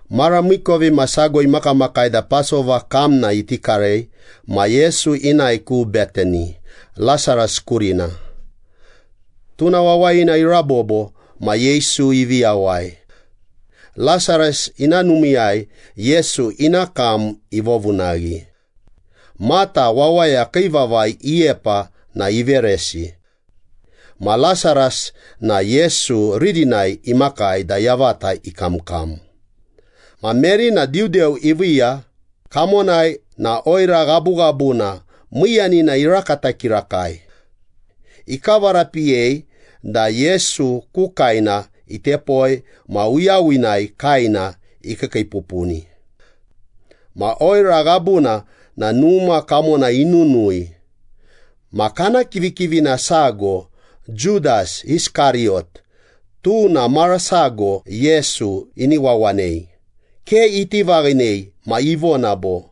Mara miikovimasago imakamakai da Pasova kamna iti karei ma Yesu inae ku Betani, Lasaras kurina. Tuna wawayina irabobo ma Yesu ivi yawai. Lasaras ina numiiyai Yesu ina kam ivovunaghi. Mata wawaya kii vavai iyepa na iveresi. Ma Lasaras na Yesu ririnai imakai da yavata ikamkam. Ma Meri na diudeu iviiya, kamonai na oira ghabughabuna miiyanina irakata kirakai. Ikavarapiyei da Yesu ku kaena itepoi ma uyawinai kaena ikiikiipupuni. Ma oira ghabuna na numa kamona inunui. Ma kana kivikivina sago, Judas Iskariyot tuna mara sago Yesu ini wawanei, ke iti vaghinei ma ivona bo,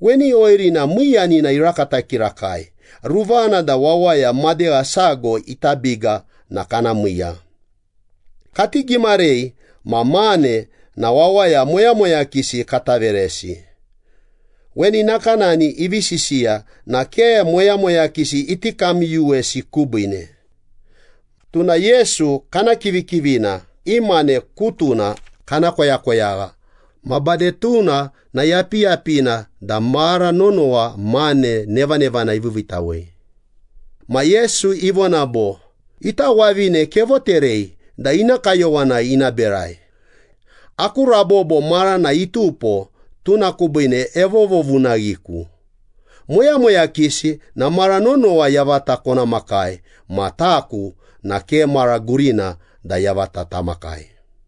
“Weni oirina miiyanina irakata kirakai, ruvana da wawaya madegha sago ita biga na kana miiya. Kati gimarei ma mane na wawaya moyamoyakisi kata veresi.” Weni nakanani ivi sisiya na ke moyamoyakisi iti kamyuyuwesi kubiine. Tuna Yesu kana kivikivina i mane kutuna kana koyakoyagha ma bade tuna na yapiyapina da mara nonowa mane nevanevana iviiviitawei. Ma Yesu ivona bo, “Ita wavine kevoterei da ina kayowanai ina berai. Aku rabobo marana itupo tuna kubiine evovovunaghiku. Moyamoyakisi na mara nonowa yavata kona makai ma taku na ke mara gurina da yavata tamakai.”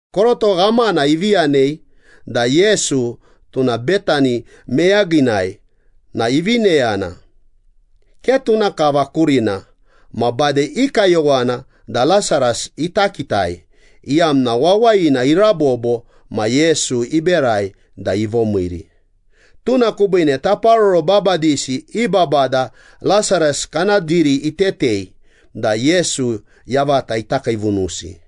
Koroto ghamana ivi yanei da Yesu tuna Betani meyaginai na ivi neyana, ke tuna kava kurina ma bade i kayowana da Lasaras ita kitai, iyamna wawayina irabobo ma Yesu iberai da ivomiiri. Tuna kubiine taparoro babadisi i babada Lasaras kana diri itetei da Yesu yavata ita kiivunusi,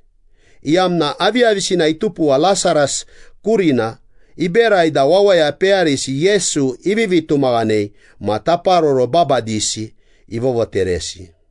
iyamna aviyavisina itupuwa Lasaras kurina iberai da wawaya peyarisi Yesu ivivi tumaghanei ma taparoro babadisi ivovoteresi.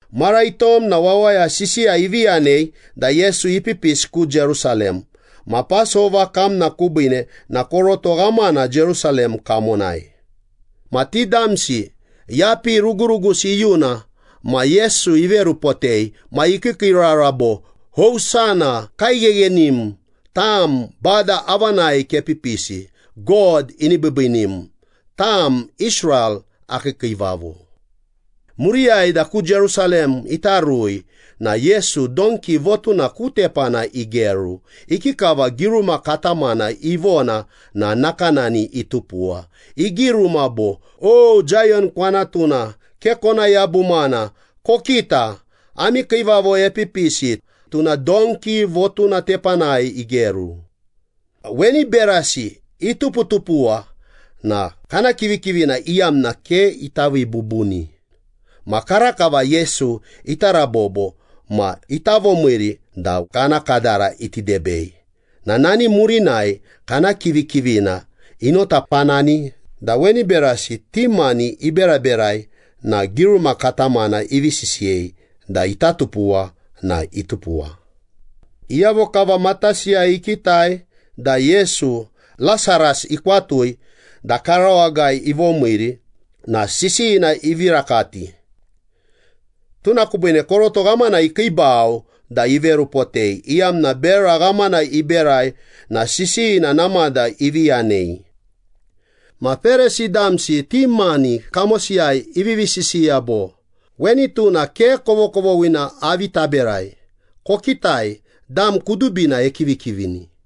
Mara itom na wawaya sisiya ivi yanei da Yesu ipipisi ku Jerusalem. Ma Pasova kamna kubiine na koroto ghamana Jerusalem kamonai. Ma ti damsi yapi rugurugusi iyuna ma Yesu iverupotei. Ma ikiikiirara bo, “Hosana! Kaigheghenim! Tam Bada avanai kepipisi! God ini biibiinim, tam Israel akii Kiivavo!” Muriyai da ku Jerusalem ita rui na Yesu donki votuna ku tepana igeru. Ikikava giruma katamana ivona na nakanani itupuwa. Igiruma bo, “O Zayon kwanatuna, ke kona yabumana. Kokita, ami kiivavo epipisi, tuna donki votuna tepanai igeru.” Weni berasi ituputupuwa na kana kivikivina iyamna ke ita vii bubuni. Ma karakava Yesu ita rabobo ma ita vomiiri da kana kadara iti debei na nani murinai kana kivikivina inotapanani da weni berasi ti mani iberaberai na giruma katamana ivi sisiyei da ita tupuwa na itupuwa. Iyavo kava matasiyai ikitai da Yesu, Lasaras ikwatui da karawagai ivomiiri na sisiyina ivi rakati. Tuna kubiine koroto ghamana ikiibau da iverupotei, iyamna bera ghamana iberai na sisiyina namada ivi yanei. Ma Perisi damsi ti mani kamosiyai ivivi sisiya bo, “Weni tuna ke kovokovoghina avi taberai. Kokitai, dam kudubina ekivikivini.”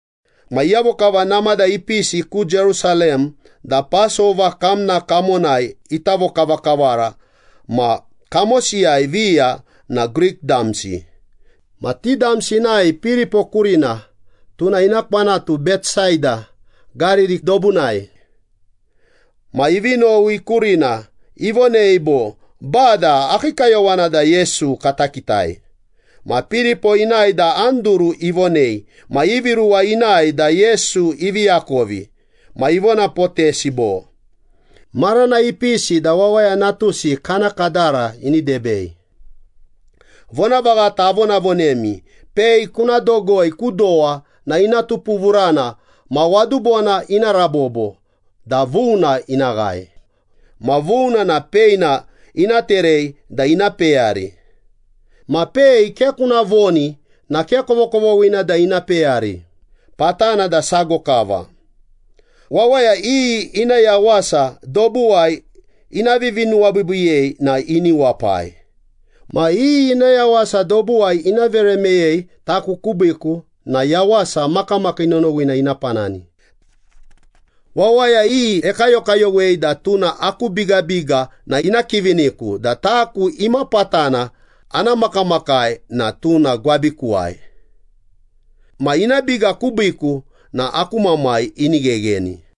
Ma iyavo kava namada ipisi ku Jerusalem da Pasova kamna kamonai ita vokavakavara ma kamosiyai viya na Grik damsi. Ma ti damsi inae Piripo kurina (tuna ina kwanatu Betsaida, Gariri dobunai). Ma ivi nowi kurina, ivonei bo, “Bada, akii kayowana da Yesu kata kitai.” Ma Piripo inae da Anduru ivonei ma ivi ruwa inae da Yesu ivi akovi. Ma ivonapotesi bo, “Marana ipisi da Wawaya Natusi kana kadara ini debei. Vonavaghata avonavonemi, pei kuna dogoi ku dowa na ina tupuvurana ma wadubona ina rabobo da vuna ina ghae. Ma vuna na peina ina terei da ina peyari. Ma pei ke kuna voni na ke kovokovoghina da ina peyari, patana da sago kava. Wawaya iyi ina yawasa dobuwai ina vivinuwabiibiiyei na ini wapai. Ma iyi ina yawasa dobuwai ina vere meyei taku kubiiku na yawasa makamakii nonowina ina panani. Wawaya iyi ekayokayowei da tuna aku bigabiga na ina kiviniku da taku imapatana ana makamakai na tuna gwabikuwai. Ma ina biga kubiiku na aku Mamai ini ghegheni.”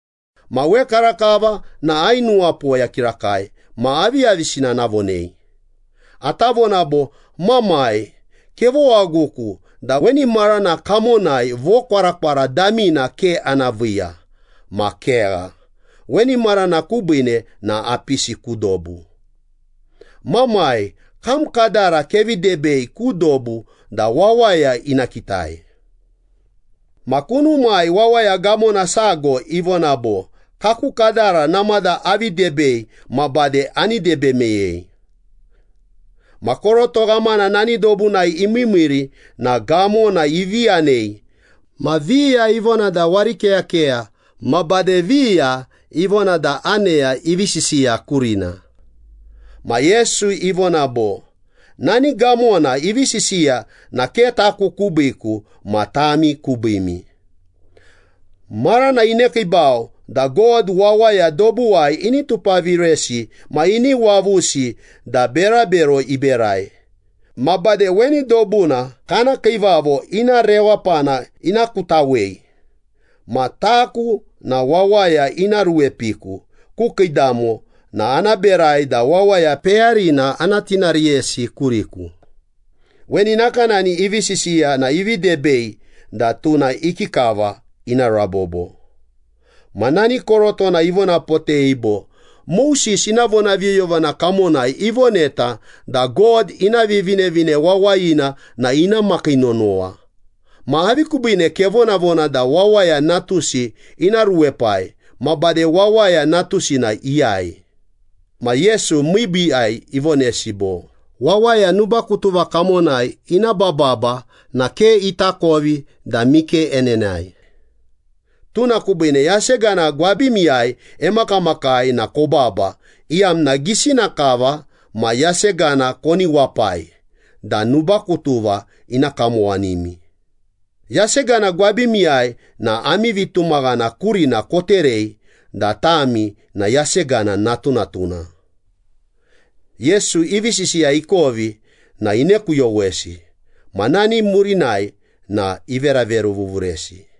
“Ma wekarakava na ainuwapoya kirakai ma aviyavisina ana vonei? Ata vona bo, ‘Mamai, kevowaguku da weni marana kamonai vokwarakwara damina ke ana viiya.’ Ma kegha, weni marana kubiine na apisi ku dobu. Mamai, kam kadara kevi debei ku dobu da wawaya ina kitai.” Ma kunumai wawaya gamona sago ivona bo, “Kaku kadara namada avi debei ma bade ani debe meyei.” Ma koroto ghamana nani dobunai imiimiiri na gamona ivi yanei. Ma viya ivona da warikeyakeya, ma bade viya ivona da aneya ivi sisiya kurina. Ma Yesu ivona bo, “Nani gamona ivi sisiya na ke taku kubiiku ma tami kubiimi. Marana inekiibau da God wawaya dobuwai ini tupaviresi ma ini wavusi da berabero iberai. Ma bade weni dobuna kana kiivavo ina rewapana ina kutawei. Ma taku na wawaya ina ruepiku ku kiidamo na ana berai da wawaya peyarina ana tinariyesi kuriku.” Weni nakanani ivi sisiya na ivi debei da tuna ikikava ina rabobo. Ma nani korotona ivonapotei bo, “Moses ina vonaviyoyovana kamonai ivoneta da God ina Vivinevine Wawayina na ina makii nonowa. Ma avi kubiine kevonavona da Wawaya Natusi ina ruepai? Ma bade Wawaya Natusi na iyai?” Ma Yesu miibiiyai ivonesi bo, “Wawaya nubakutuva kamonai ina bababa na ke itakovi da mike enenae. Tuna kubiine yasegana gwabimiyai emakamakai na kobaba, iyamna gisina kava ma yasegana koni wapai da nubakutuva ina kamowanimi. Yasegana gwabimiyai na ami vitumaghana kurina koterei da tami na yasegana natunatuna.” Yesu ivi sisiya ikovi na inekuyowesi. Ma nani murinai na iveraveruvuvuresi.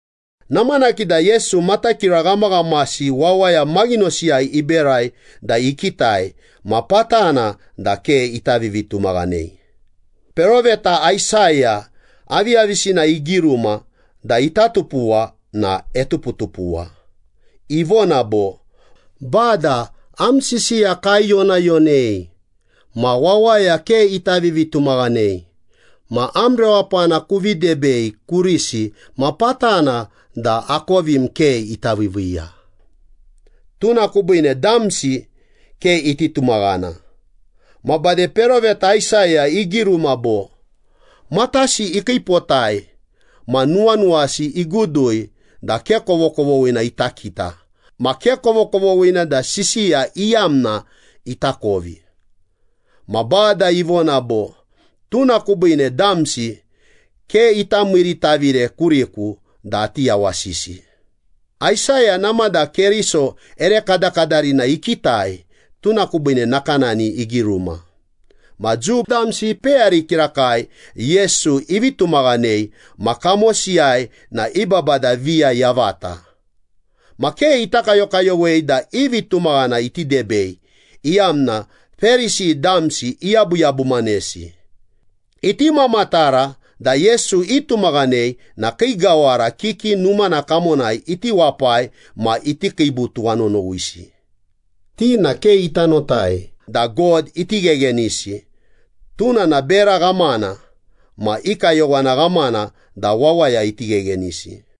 Namanaki da Yesu matakira ghamaghamasi wawaya maghinosiyai iberai da ikitai ma patana da ke ita vivitumaghanei. Peroveta Aisaya aviyavisina igiruma da ita tupuwa na etuputupuwa. Ivona bo, “Bada, am sisiya kaiyonayonei ma wawaya ke ita vivitumaghanei. Ma am rewapana kuvi debei kurisi ma patana da akovim ke ita viiviiya.” Tuna kubiine damsi ke iti tumaghana. Ma bade peroveta Aisaya igiruma bo, “Matasi ikiipotai, ma nuwanuwasi igudui da ke kovokovoghina ita kita, ma ke kovokovoghina da sisiya iyamna itakovi. Ma Bada ivona bo, ‘Tuna kubiine damsi ke ita miiritavire kuriku da ati yawasisi.’” Aisaya namada Keriso ere kadakadarina ikitai, tuna kubiine nakanani igiruma. Ma Jiu damsi ipeyari kirakai Yesu ivi tumaghanei ma kamosiyai na i babada viya yavata. Ma ke ita kayokayowei da i vitumaghana iti debei, iyamna Perisi damsi iyabuyabumanesi. Iti mamatara da Yesu itumaghanei na kii gawara kiki numana kamonai iti wapai ma iti kiibu tuwanonowisi. Ti na ke ita notai da God iti gheghenisi, tuna na bera ghamana. Ma i kayowana ghamana da wawaya iti gheghenisi.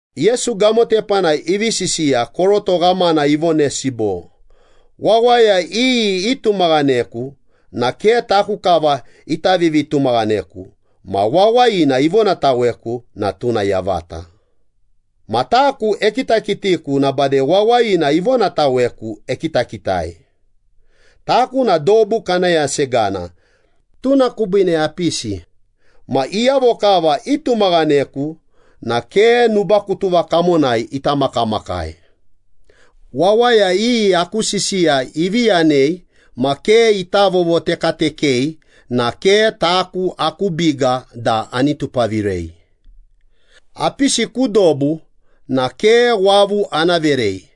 Yesu gamo tepanai ivi sisiya, koroto ghamana ivonesi bo, “Wawaya iyi itumaghaneku na ke taku kava ita vivitumaghaneku ma wawayina ivonataweku na tuna yavata. Ma taku ekitakitiku na bade wawayina ivonataweku ekitakitai. Taku na dobu kana yasegana, tuna kubiine apisi. Ma iyavo kava itumaghaneku na ke nubakutuva kamonai ita makamakai. Wawaya iyi aku sisiya ivi yanei ma ke ita vovotekatekei na ke taku aku biga da ani tupavirei. Apisi ku dobu na ke wavu ana verei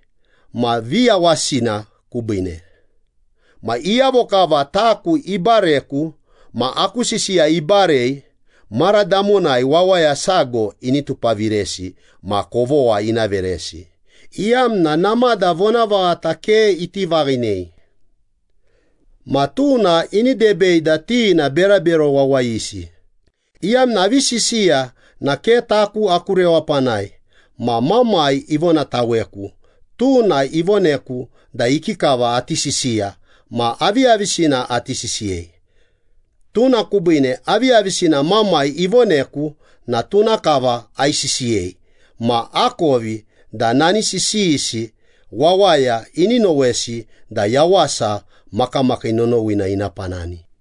ma viyawasina kubiine. Ma iyavo kava taku ibareku ma aku sisiya ibarei, mara damonai wawaya sago ini tupaviresi ma kovogha ina veresi, iyamna namada vonavaghata ke iti vaghinei. Ma tuna ini debei da ti na berabero wawayisi, iyamna avi sisiya na ke taku aku rewapanai, ma Mamai ivonataweku, tuna ivoneku da ikikava ati sisiya ma aviyavisina ati sisiyei. Tuna kubiine aviyavisina Mamai ivoneku na tuna kava aisisiyei ma akovi da nani sisiyisi wawaya ini nowesi da yawasa makamakii nonowina ina panani.”